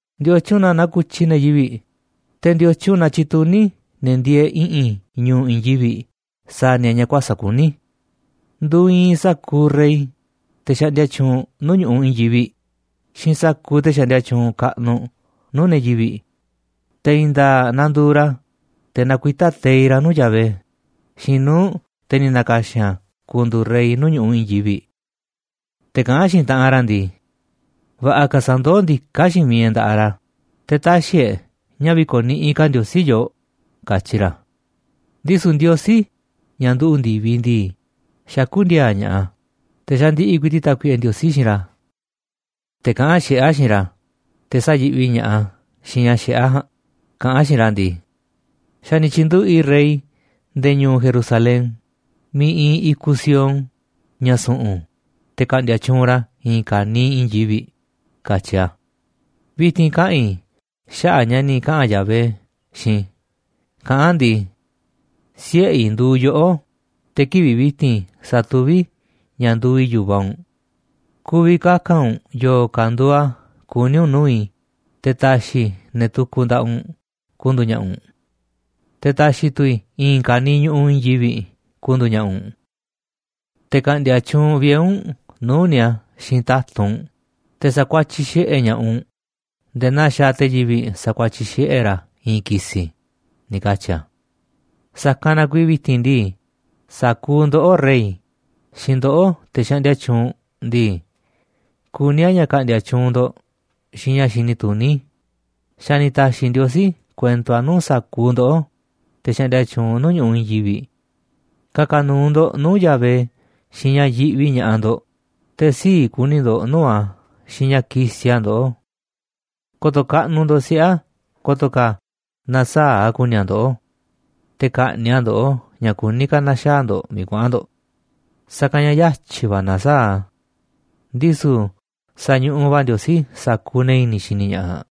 ¿Ndiotyun na naku̱tyi ne̱ yivi̱ꞌ, te̱ ndiotyun na tyituní ne̱ ndieeꞌ i̱ꞌi̱n ñu̱u̱ i̱i̱n yivi̱ꞌ sa̱a̱ ni̱a̱ ña̱ kuäsa̱ꞌ kuní? Nduuꞌ iinꞌ sa̱kuuꞌ rey, te̱ xaꞌndia tyuunꞌ nuu̱ꞌ ñu̱ꞌuꞌ i̱i̱n yivi̱ꞌ xiinꞌ sa̱kuuꞌ te̱ xaꞌndia tyuunꞌ kaꞌnuꞌ nuu̱ꞌ ne̱ yivi̱ꞌ, te̱ i̱i̱n nda̱a̱ꞌ nanduuꞌ ra̱, te̱ nakuitá teiꞌ ra̱ nuu̱ꞌ Yahvé xiinꞌ nuu̱ꞌ te̱ ni̱ na̱ka̱xi̱n a̱ ku̱ndu̱u̱ rey nuu̱ꞌ ñu̱ꞌuꞌ i̱i̱n yivi̱ꞌ. Te̱ kaꞌán xiinꞌ taꞌanꞌ ra̱ ndii: “Va̱ꞌa̱ ka̱ sa̱ndoó ndiká xiinꞌ miiꞌ e̱ꞌ nda̱ꞌaꞌ ra̱, te̱ tä̱xi̱ e̱ꞌ ña̱ vi̱ko̱niꞌiꞌ ka̱ Ndiosí yooꞌ”, katyi ra̱. Ndisu̱ Ndiosí, ña̱ nduꞌu̱ꞌ ndi̱viꞌ ndii, xakú ndi̱a̱a̱ ña̱ꞌaꞌ a̱, te̱ xandiꞌiꞌ ku̱i̱ti̱ꞌ Tákuiꞌe Ndiosí xiinꞌ ra̱. Te̱ kaꞌán xiꞌé a̱ xiinꞌ ra̱, te̱ sayi̱ꞌvi ña̱ꞌaꞌ a̱ xiinꞌ ña̱ xiꞌé a̱ ja̱a̱nꞌ, kaꞌán a̱ xiinꞌ ra̱ ndii: “Xa̱ ni̱ tyi̱nduꞌu̱ꞌ i̱ rey nde̱e̱ ñu̱u̱ Jerusalén miiꞌ iinꞌ i̱kuꞌ Sión, ña̱ su̱ꞌu̱n, te̱ ka̱ꞌndi̱a̱ tyuunꞌ ra̱ i̱i̱n ka̱niiꞌ i̱i̱n yivi̱ꞌ”, katyi̱ a̱. Vi̱ti̱n kaꞌa̱n i̱ xaꞌa̱ꞌ ña̱ ni̱ kaꞌa̱n Yahvé xiinꞌ i̱, kaꞌán a̱ ndii: “Siꞌe̱ i̱ nduuꞌ yoꞌó, te̱ kivi̱ꞌ vi̱ti̱n sa̱tuví i̱ ña̱ nduuꞌ i̱ yu̱vaꞌ u̱nꞌ. Ku̱vi̱ kaka̱n u̱nꞌ yo̱o̱ ka̱ nduuꞌ a̱ kuní u̱nꞌ nuu̱ꞌ i̱, te̱ ta̱xi̱ i̱ ne̱ tukuꞌ nda̱ꞌaꞌ u̱nꞌ ku̱ndu̱u̱ ña̱ꞌa̱ u̱nꞌ, te̱ ta̱xi̱ tu̱ i̱ i̱i̱n ka̱niiꞌ ñu̱ꞌuꞌ i̱i̱n yivi̱ꞌ ku̱ndu̱u̱ ña̱ꞌa̱ u̱nꞌ. Te̱ ka̱ꞌndi̱a̱ tyuunꞌ vie̱ u̱nꞌ nuu̱ꞌ ni̱a̱ xiinꞌ ta̱tunꞌ u̱nꞌ, te̱ sakuatyiꞌ xiꞌe̱ ña̱ꞌaꞌ u̱nꞌ nde̱e̱ naa xaaꞌ te̱ yivi̱ꞌ sakuatyiꞌ xiꞌe̱ ra̱ i̱i̱n ki̱si̱”, ni̱ katyi̱ a̱. Sa̱kanꞌ na kuiiꞌ vi̱ti̱n ndii, sa̱kuuꞌ ndoꞌó, rey, xiinꞌ ndoꞌó, te̱ xaꞌndia tyuunꞌ ndii, kuní a̱ ña̱ ka̱ꞌndi̱a̱ tyuunꞌ ndo̱ꞌ xiinꞌ ña̱ xini tuní, xa̱ ni̱ ta̱xi̱ Ndiosí kuento a̱ nuu̱ꞌ sa̱kuuꞌ ndoꞌó, te̱ xaꞌndia tyuunꞌ nuu̱ꞌ ñu̱ꞌuꞌ i̱i̱n yivi̱ꞌ. Ka̱ka̱ nu̱u̱ ndo̱ꞌ nuu̱ꞌ Yahvé xiinꞌ ña̱ yiꞌvi ña̱ꞌaꞌ ndo̱ꞌ, te̱ sii̱ꞌ ku̱ni̱ ndo̱ꞌ nuu̱ꞌ a̱ xiinꞌ ña̱ kisiꞌ a̱ ndoꞌó. Ko̱to̱ kaꞌnuꞌ ndo̱ꞌ siꞌe̱ a̱, ko̱to̱ ka̱ na̱saa̱ꞌ a̱ ku̱ni̱ a̱ ndoꞌó, te̱ ka̱ꞌni̱ꞌ a̱ ndoꞌó ña̱ kuní ka̱ na̱xaa̱ ndo̱ꞌ miiꞌ kuaꞌa̱n ndo̱ꞌ. Sa̱kanꞌ ña̱ yatyi̱ va̱ nasaáꞌ a̱. Ndisu̱ sañuꞌuꞌ va̱ Ndiosí sa̱kuuꞌ ne̱ i̱ni̱ xini ña̱ꞌaꞌ.